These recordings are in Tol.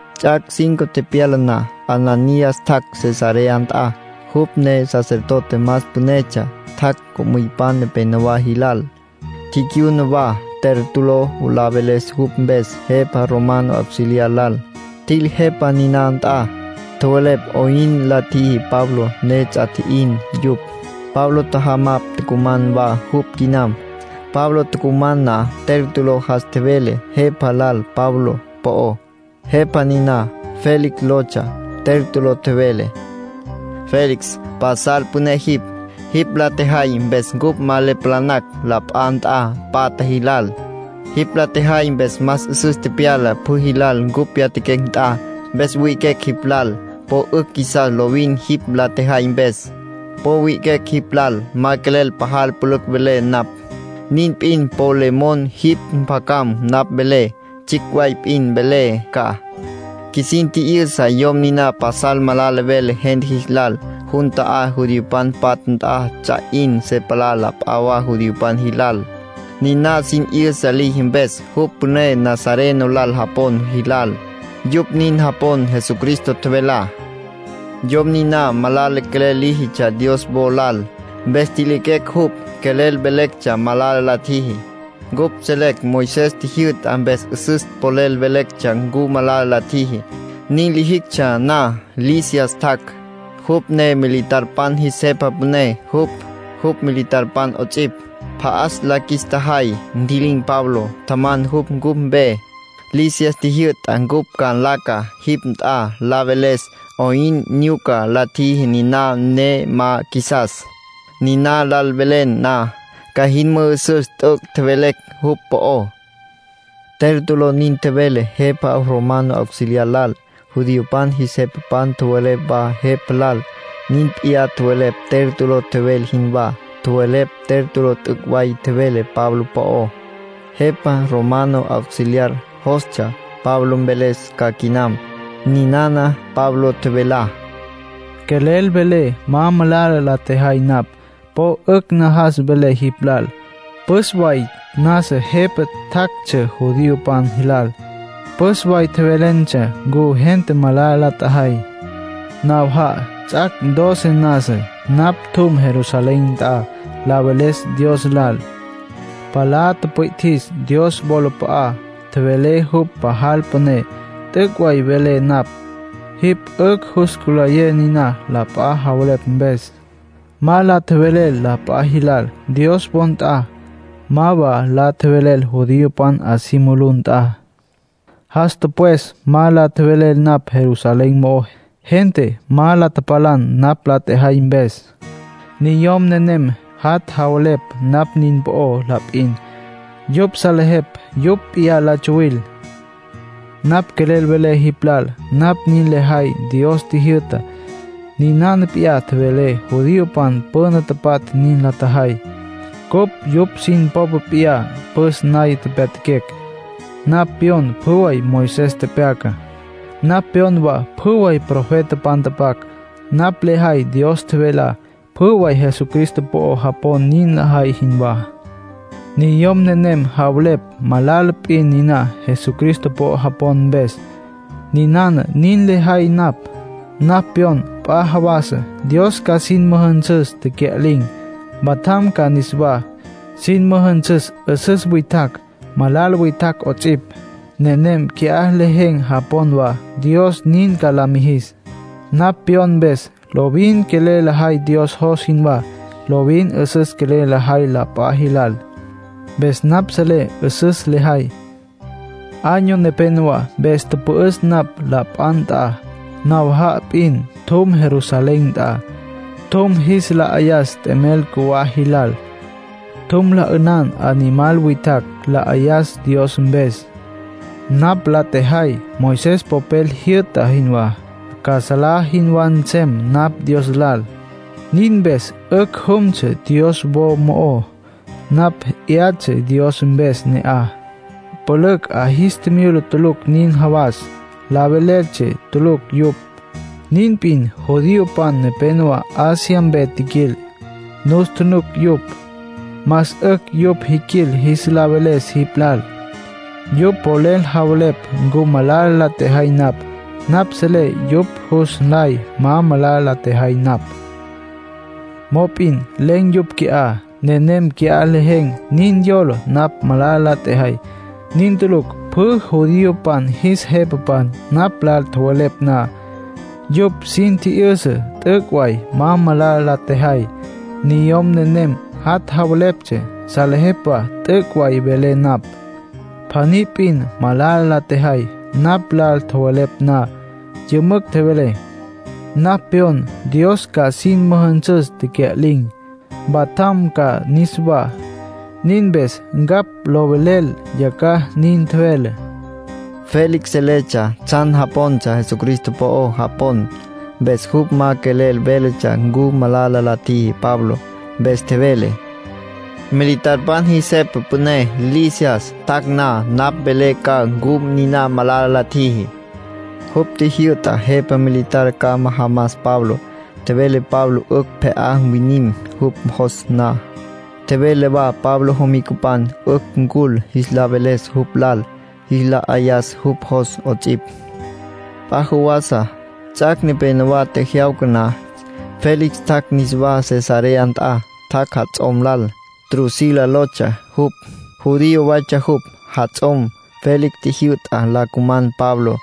Ts'ac' cinco tepyala na, Ananías tjac' Cesarea nt'a. Jupj ne sacerdote más pünetsja. Tjac' co'müypan nepenowá jilal. Ticyuna wa Tértulo la veles yupj mpes jepa romano auxiliar lal. Tjil jepa niná nt'a. Tjowelepj 'oyn la tjiji Pablo ne ts'a tji'in yupj. Pablo tjajamapj tucuman wa jupj quinam. Pablo tucuman na Tértulo jas tjevele jepa lal Pablo po'ó. Jepa niná Félix lotsja. Tértulo tjevele: —Félix, pasal püné jipj. Jipj la tjejay mpes cupj ma le palanacj la p'a nt'a patja jilal. Jipj la tjejay mpes más 'üsüs tepyala pjü jilal cupj pyatjaquecj nt'a. Mpes wi'iquecj jipj lal. Po 'ücj qjuisas lovin jipj la tjejay mpes. Po wi'iquecj jipj lal. Ma quelel pajal pülücj velé napj. Nin p'in po le mon jipj mpjacam napj velé. Tsjicj way p'in mvelé ca. Qjuisin tji'yüsa yom niná pasal malala vele gente jis lal. Jun ta'á judiopan patja nt'a ts'a 'in se palá la p'a wa judiopan jilal, niná sin 'yüsa liji mpes. Jupj püné Nazareno lal japon jilal. Yupj nin japon Jesucristo tjevelá. Yom niná malala quelel líjitsja Dios wo lal. Mpes ntjiliquecj jupj. Quelel velectsja malala la tjiji. Cupj selecj Moisés tjijyü'tá, mpes 'üsüs polel velectsja ncu malala la tjiji. Nin lijictsja na, Lisias tjac', jupj ne militarpan jis jepa püné. Jupj, jupj militarpan 'ots'ipj, pja'as la qjuis tjajay, ntji'lin̈ Pablo, tjaman jupj cupj mpe. Lisias tjijyü'ta cupj ca nlaca jipj nt'a la veles 'oyn nyuca la tjiji niná ne ma qjuisas. Niná lal velen na, ca jin mü'üsüs t'üc' tjevelecj jupj po'ó —Tértulo nin tjevele jepa romano auxiliar lal. Judiopan jis jepapan tjowelepj wa jepa lal. Nin p'iyá tjowelepj Tértulo tjevele jinwá. Tjowelepj Tértulo t'üc' way tjevele Pablo po'ó. Jepa romano auxiliar jostsja Pablo mveles ca quinam. Ninana Pablo tjevelá: —Quelel velé ma malala la tjejay napj. Po 'ücj najas velé jipj lal; püs way nasa jepa tjactsja jipj judiopan jilal. Püs way tjevelentsja ncu gente malala la tjajay. Nawaja'a, ts'ac' doce nasa, napj tjum Jerusalén nt'a la veles Dios lal. Palá tüpwi'tjis Dios wolap'a'á, tjevelé jupj pajal püné. T'üc' way velé napj, jipj 'ücj jus cülayé niná la p'a javelepj mpes. Ma la tjevelel la p'a jilal Dios wo nt'a. Ma wa la tjevelel judiopan 'a si mulú nt'a. Jas tüpwes ma la tjevelel napj Jerusalén mo'ó. Gente ma la tapalan napj la tjejay mpes. Niyom nenem jat' javelepj napj nin po'ó la p'in. Yupj salejepj yupj p'iyá la tsuwil. ”Napj quelel velé jipj lal napj nin lejay Dios tjijyü'tá. Ninana p'iyá tjevele, judiopan püna tapatja nin la tjajay. Cupj yupj sin popa p'iyá püs naya pyatjaquecj. Napj pyon pjü way Moisés tepyacá. Napj pyon wa pjü way profetapan tapac. Napj lejay Dios tjevelá, pjü way Jesucristo po'o japon nin lajay jinwá. Niyom nenem javelepj malala p'in niná Jesucristo po'o japon mpes. Niná nin lejay napj. Napj pyon p'a jawasa Dios ca sin müjünsüs tecya'lin̈, mpatjam ca niswá. Sin müjünsüs 'üsüs witjacj, malala witjacj 'ots'ipj. Nenem qui'á lejen̈ japon wa Dios nin ca la mijis. Napj pyon mpes, lovin quelel lejay Dios jos jinwá. Lovin 'üsüs quelel lejay la p'a jilal. Mpes napj selé 'üsüs lejay. ”Año nepénowa mpes tüpü'üs napj la p'a nt'a. Nawaja'a p'in tjum Jerusalén nt'a. Tjum jis la 'ayas t'emel cjuwá jilal. Tjum la 'ünan animal witjacj, la 'ayas Dios mpes. Napj la tjejay Moisés popel jyü'ta jinwá, ca salá jinwá nsem napj Dios lal. Nin mpes 'ücj jumtsja Dios wo mo'ó. Napj 'yatsja Dios mpes ne'aj. Pülücj 'a jis tjimyula tulucj nin jawas, la veleltsja tulucj yupj. Nin p'in judiopan nepenowá Asia mpe tjiquil, nus tjunuc yupj. Más 'ücj yupj jiquil jis la veles jipj lal. Yupj polel javelepj ncu malala la tjejay napj. Napj selé yupj jus nlay ma malala la tjejay napj. Mop'in len̈ yupj qui'á. Nenem qui'á lejen̈ nin yola napj malala la tjejay. Nin tulucj. Pjü judiopan jis jepapan napj lal tjowelepj na, yupj sin tji'yüsa t'üc' way ma malala la tjejay. Niyom nenem jat' javelepj, salejepj wa t'üc' way velé napj. Pjaní p'in malala la tjejay. Napj lal tjowelepj na, yümücj tjevelé: ‘Napj pyon Dios ca sin müjünsüs tecya'lin̈, mpatjam ca niswá. Nin mpes ncapj lo velelé yacjaj’, nin tjevelé. Félix seletsja tsjan japontsja Jesucristo po'o japon. Mpes jupj ma quelel véletsja ncu malala la tjiji Pabló. Mpes tjevele: —Militarpan jis jepa püné, Lisias, tjac' na, napj mvelé ca ncu niná malala la tjiji —nin tjevele. Jupj tjijyü'ta jepa militar ca majamas Pablo. Tjevele Pablo 'ücj pje'á mwinim jupj jos na. Tjevele wa Pablo jomicapan 'ücj ncul jis la veles jupj lal, jis la 'ayas jupj jos 'ots'ipj. P'a jawasa, ts'ac' nepénowa tjejyawca na, Félix tjac' niswá Cesarea nt'a. Tjac' jats'om lal, Drusila lotsja jupj. Judío waytsja jupj, jats'om. Félix tjijyü'ta la cuman Pablo.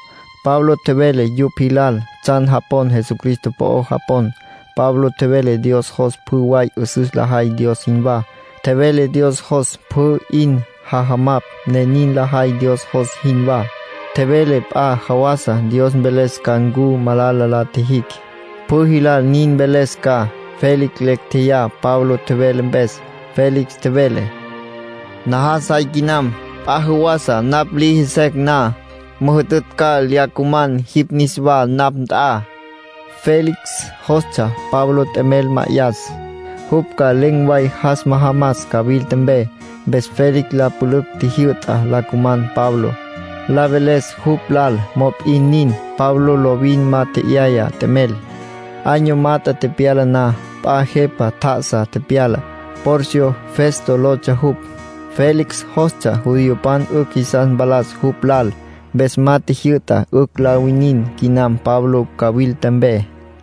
Pablo tjevele yupj jilal tsjan japon Jesucristo po'o japon. Pablo tjevele Dios jos pjü way 'üsüs lajay Dios jinwá. Tjevele Dios jos pjü 'in jajamapj ne nin lajay Dios jos jinwá. Tjevele p'a jawasa Dios mveles ca ncu malala la tjijicj. Pjü jilal nin mveles ca. Félix lecj tjeyá Pablo tjevele mpes. Félix tjevele: “Najas jay quinam. P'a jawasa, napj liji secj na, müjütütj ca lya cuman jipj niswá napj nt'a.” Félix jostsja Pablo t'emel ma'ayas, jupj ca len̈ way jas majamas cawilta mpe. Mpes Félix la pülücj tjijyü'ta la cuman Pablo, la veles jupj lal. Mop'in nin, Pablo lovin ma tje'yaya t'emel. Año mat'e tepyala na, p'a jepa tjá'asa tepyala. Porcio Festo lotsja jupj. Félix jostsja judiopan 'ücj jisas mpalas jupj lal. Mpes ma tjijyü'ta 'ücj la winin quinam Pablo cawilta mpe.